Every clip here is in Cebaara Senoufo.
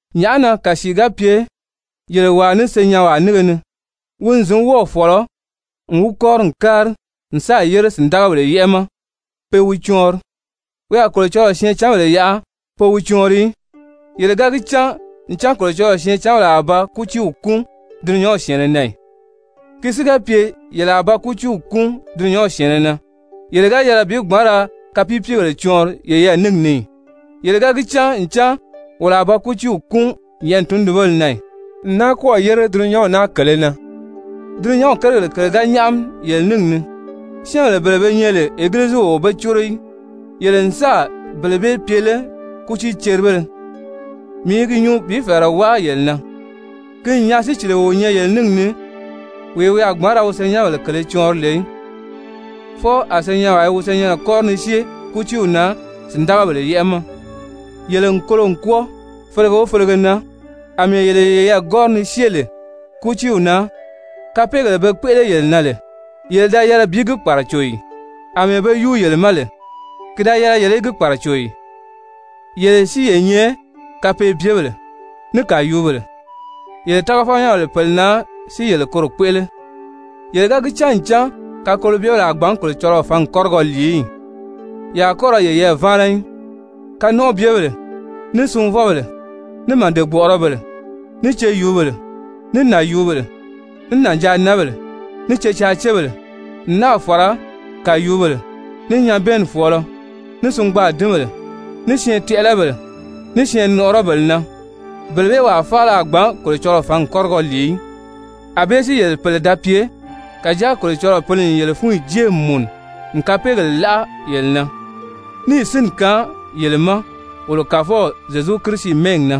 Nyàʔá na kàsii ga pye yele wàa ní senyɛnwaa nínge ni, wi n zǐn wɔ́ɔ̀ fɔ̀lɔ n wi kɔ́ri n kári n sáà yére sìndagabèle yɛ́ʔɛ ma pe wi cɔɔnri, wi a Kolocɔlɔɔ syɛɛncanbèle yaʔa pe wi cɔɔnri í? Yele ga gi cán ncan Kolocɔlɔɔ syɛɛncanbèle a ba kútiiw kúun dulunyanw syɛ̀ɛnnɛ na ì? Ki si ga pye yele a ba kútiiw kúun dulunyanw syɛ̀ɛnnɛ na, yele ga yɛlɛ bi gbǎn ra kapiipiigèle cɔɔnri yeyɛɛ níngi ni ì? Yele ga gi cán ncan wolo a ba kútiiw kúun nyɛ̀ʔɛni tundunbéle na ì, n náa kɔ́ɔ̀ yére dulunyanw naa kèlē na? Dulunyanw kérigèle kèle ga nyáʔami yele níngi ni, syɛ́ɛnbèle bele be nyɛ lè Egiliziw o be córo í, yele n sáà bele bee pye lé kútiiceribéle? Mii i gi nyuu bi fɛ̀ɛrɛ wáa yele na. Ki n nyaa sícilio o nyɛ yele níngi ni wee wi a gbǎn ra wi senyɛnbèle kèlē cɔɔnri lè í! Fwɔɔ a senyɛnwaa i wi senyɛnnɛ kɔ́ri ni syée kútiiw na sìndagabèle yɛ́ʔɛ ma! Yele n kolo n kwɔ́ɔ felege o felege na, àmɛɛ yele yeyɛɛ kɔ́ri ni syée lè kútiiw na. Kapeegèle be kpéʔele yele na lè, yele da yɛlɛ bi gi kpàraco ì? Amɛɛ be yúu yele ma lè, ki da yɛlɛ yele í gi kpàraco ì? Yele si ye nyɛ kapeebyebèle, ní kàyuubèle, yele tágafɔnyɛnbèle pèle na si yele koro kpéʔele! Yele ga gi cán ncan kakolobyebèle a gbǎn Kolocɔlɔɔ fǎngi kɔ́rigɔ lìi í ì? Ye a kɔ́ ra yeyɛɛ váana í, kanɔnʔɔbyebèle, ní sunvɔbèle, ní màde-gbɔ̀ʔɔrɔbèle, ní ceyuubèle, ní nànyuubèle, ní nànjaanǎnbèle, ní cecaacebèle, n náà fàra kàyuubèle, ní nyabɛɛnni fɔ̀ɔlɔ, ní singbaadinbèle, ní syɛɛntɛʔɛlɛbèle, ní syɛɛnnɔʔɔrɔbèle na, bele bee wàa faala a gbǎn Kolocɔlɔɔ fǎngi kɔ́rigɔ lìi í. Anbée si yele pèle da pye. Kàjáa Kolocɔlɔɔ Pǐli n yele fúnyi jée n mùnu n kapeegèle láʔa yele na, níì sínni kaan yele ma wolo Kàfɔw Zyezu Kirisi mɛ́ɛgi na.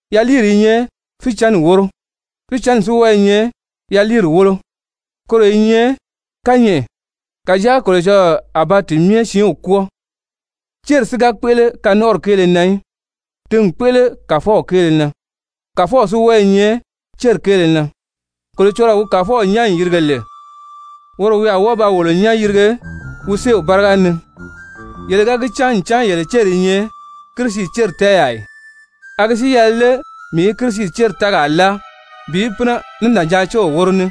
Yaliiri i nyɛ fícɛnni wóro, fícɛnni si wɔ́ɔ i nyɛ yaliiri wólo, koro i nyɛ kányɛʔɛ, kàjáa Kolocɔlɔɔ a ba ti myɛ siinw kwɔ́ɔ. Céri si ga kpéʔele kanɔnʔɔri kéele na í. Ti n kpéʔele Kàfɔw kéele na, Kàfɔw si wɔ́ɔ i nyɛ céri kéele na. Kolocɔlɔɔ wi Kàfɔw nyán n yìrige lè, woro wi a wɔ́ɔ ba wolo nyán yìrige wi séew báriga ni. Yele ga gi cán ncan yele céri i nyɛ Kirisi céri tɛ́ɛyaa ì? A gi si yɛlɛ lé mii í Kirisi céri tɛ́ɛgaa láa bi pínɛ ní nànjaacew wóro ní?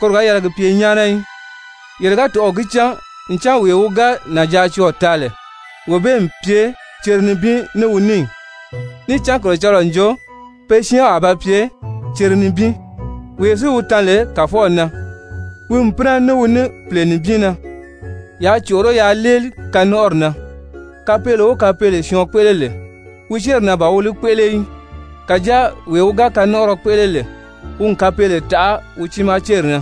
Koro ga yɛlɛ gi pye nyáana í. Yele ga tɔ̀ʔɔ̂ gi cán ncan wee wi ga nànjaacɔɔ̀ taa lè, wee bee n pye cere nibin ní wi ní ì? Níì cán Kolocɔlɔɔ n jo «pe siinw a ba pye cere nibin.» Wee si wi tan lè Kàfɔw na, wi n pínɛ ní wi ní pìle nibin na. Yaa còʔoró yaa léeli kanɔnʔɔri na. Kapeele o kapeele syɔɔn kpéʔele lè, wi céri na ban wi li kpéʔele í. Kàjáa wee wi ga kanɔnʔɔrɔ kpéʔele lè, wi n kapeele taʔa wi tiimaa céri na.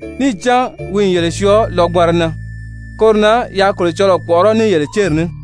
Níì cán wi n yele syɔɔ lɔgbanra na. Koro na yaa Kolocɔlɔɔ kpɔ̀ʔɔrɔ́ ní yele céri ní.